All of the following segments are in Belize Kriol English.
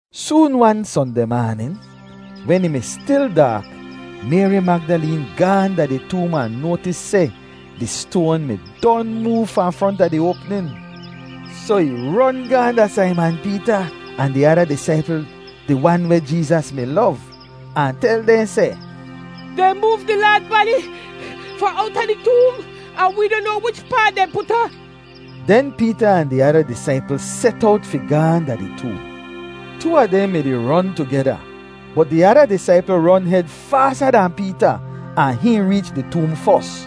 Soon-wan Sondeh maanin, wen ih mi stil daak, Mayri Magdaleen gaahn da di toom ahn noatis seh di stoan mi don moov fahn fronta di oapnin. Soh ih ron gaahn da Saiman Peeta ahn di ada disaipl, di wan weh Jeezas mi lov, ahn tel dehn seh, “Dehn moov di Laad badi fahn owta di toom, ahn wee noh noa wichpaa dehn put ahn.” Den Peeta ahn di ada disaipl set owt fi gaahn da di toom. Too a dehn mi-di ron tugeda, bot di ada disaipl ron hed faasa dahn Peeta ahn hihn reech di toom fos.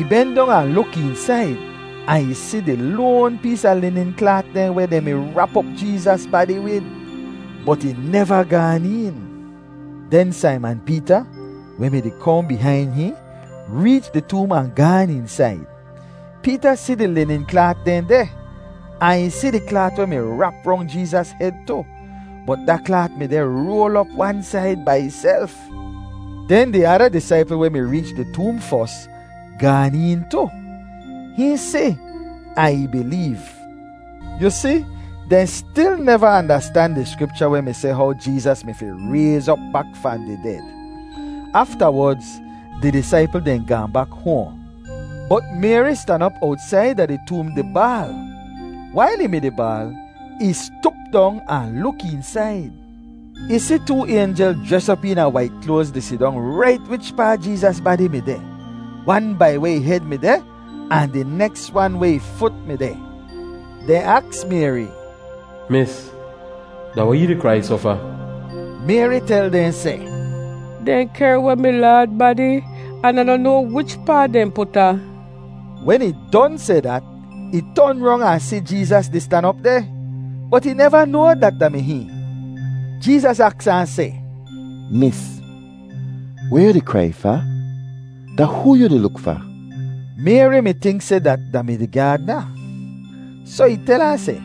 Ih ben dong ahn luk eensaid ahn ih si di loan pees a linin klaat dehn weh dehn mi rap op Jeezas badi wid, bot ih neva gaan een. Den Saiman Peeta, weh mi-di kohn bihain hihn, reech di toom ahn gaan eensaid. Peeta si di linin klaat dehn deh, ahn ih si di klaat weh mi rap rong Jeezas hed tu, bot da klaat mi deh roal op wan said bai ihself. Den di ada disaipl weh mi reech di toom fos, gaan een tu. Hihn si, ahn ih bileev. Yu si, dehn stil neva andastan di Skripcha weh mi seh how Jeezas mi fi rayz op bak fahn di ded. Aftawodz di disaipl dehn gaahn bak hoahn. Bot Mayri stan op owtsaida di toom di baal. Wail ih mi-di baal, ih stup dong ahn luk eensaid. Ih si too aynjel jres op eena wait kloaz di sidong rait wichpaa Jeezas badi mi deh, wan bai weh ih hed mi deh, ahn di neks wan weh ih fut mi deh. Dehn aks Mayri, “Mis, da weh yu di krai soh fa?” Mayri tel dehn seh, “Dehn kehr weh mi Laad badi an Ah noh noa wichpaa dehn put ahn.” Wen ih don seh dat, ih ton rong ahn si Jeezas di stan op deh, bot ih neva noa dat da mi hihn. Jeezas aks ahn seh, “Mis, weh yu di krai fa? Da hoo yu di luk fa?” Mayri mi tink seh dat da mi di gyaadna, soh ih tel ahn seh,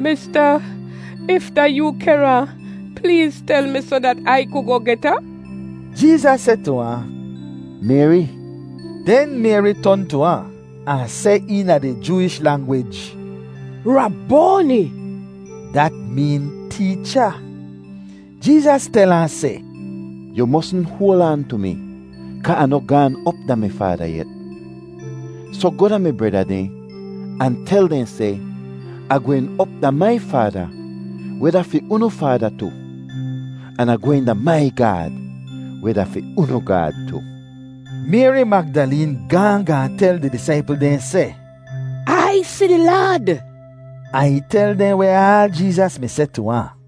“Mista, if da yoo kehr ahn, pleez tel mi soh dat Ai ku goh get ahn.” Jeezas seh tu ahn, “Mayri!” Den Mayri ton tu ahn, ahn seh eena di Jooish langwij, “Raboani!” (Dat meen Teecha.) Jeezas tel ahn seh, “Yu mosn hoal aan tu mi kaa Ah noh gaan op da mi Faada yet. Soh goh da mi breda dehn ahn tel dehn seh, ‘Ah gwehn op da mai Faada, weh da fi unu Faada tu, an Ah gwehn da mai Gaad, weh da fi unu Gaad tu.’” Mayri Magdaleen gaahn gaahn tel di disaipl dehn seh, “Ai si di Laad!” Ahn ih tel dehn weh aal Jeezas mi seh tu ahn.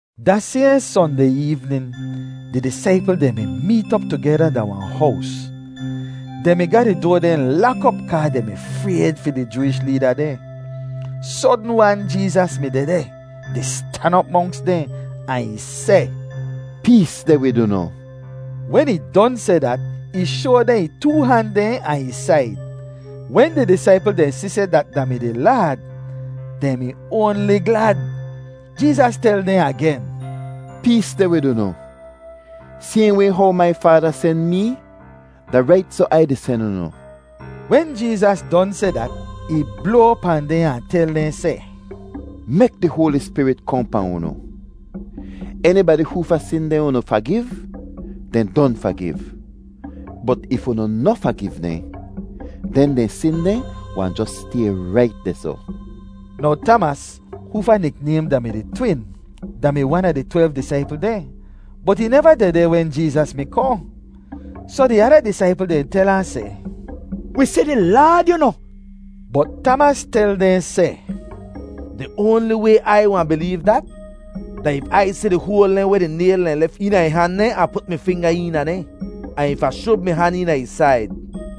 Da sayhn Sondeh eevnin di disaipl dehn mi meet op tugeda da wahn hows. Dehn mi ga di doa dehn lak op kaa dehn mi frayd fi di Jooish leeda dehn. Sodn-wan Jeezas mi dehdeh di stan op monks dehn ahn ih seh, “Pees deh wid unu.” Wen ih don seh dat, ih shoa dehn ih too han dehn ahn ih said. Wen di disaipl dehn si seh dat da mi di Laad, dehn mi oanli glad. Jeezas tel dehn agen, “Pees deh wid unu. Sayhn way how mai Faada sen mee, da rait soh Ai di sen unu.” Wen Jeezas don seh dat, ih bloa pahn dehn ahn tel dehn seh, “Mek di Hoali Spirit kohn pahn unu. Enibadi hoofa sin dehn unu fagiv, dehn don fagiv, bot if unu noh fagiv dehn, den dehn sin dehn wahn jos stay rait dehsoh.” Now Tamas, hoofa niknaym da-mi di Twin, da-mi wan a di twelv disaipl dehn, bot ih neva dehdeh wen Jeezas mi kohn. Soh di ada disaipl dehn tel ahn seh, “Wi si di Laad, yu noh.” Bot Tamas tel dehn seh, “Di oanli way Ai wahn bileev dat, da if Ai si di hoal dehn weh di nayl dehn lef eena ih han dehn ahn put mi finga eena dehn, ahn if Ah shub mi han eena ih said.”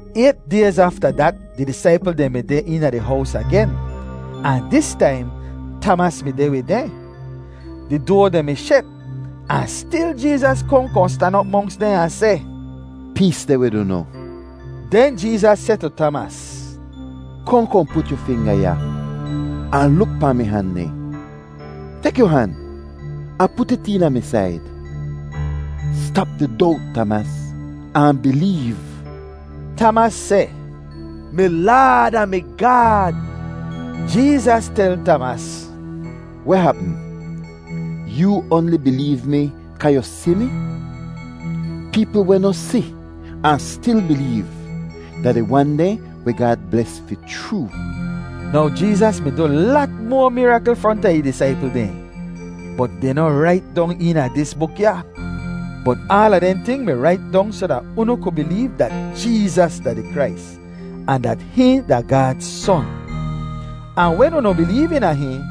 Ayt dayz afta dat di disaipl dehn mi deh eena di hows agen, ahn dis taim, Tamas mi deh wid dehn. Di doa dehn mi shet ahn stil Jeezas kohn kohn stan op monks dehn ahn seh, “Pees deh wid unu.” Den Jeezas seh tu Tamas, “Kohn kohn put yu finga ya ahn luk pahn mi han dehn. Tek yu han ahn put it eena mi said. Stap di dowt, Tamas, ahn bileev.” Tamas seh, “Mi Laad ahn mi Gaad!” Jeezas tel Tamas, “Weh hapm? Yoo oanli bileev mi kaa yu si mi? Peepl weh noh si, ahn stil bileev, da di wan dehn weh Gaad bles fi chroo.” Now Jeezas mi du lat moa mirakl fronta ih disaipl dehn, bot dehn noh rait dong eena dis buk ya. Bot aala dehn ting mi rait dong soh dat unu ku bileev dat Jeezas da di Krais, ahn dat hihn da Gaad Son. Ahn wen unu bileev eena hihn,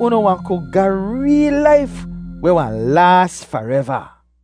unu wahn ku ga reel laif weh wahn laas fareva.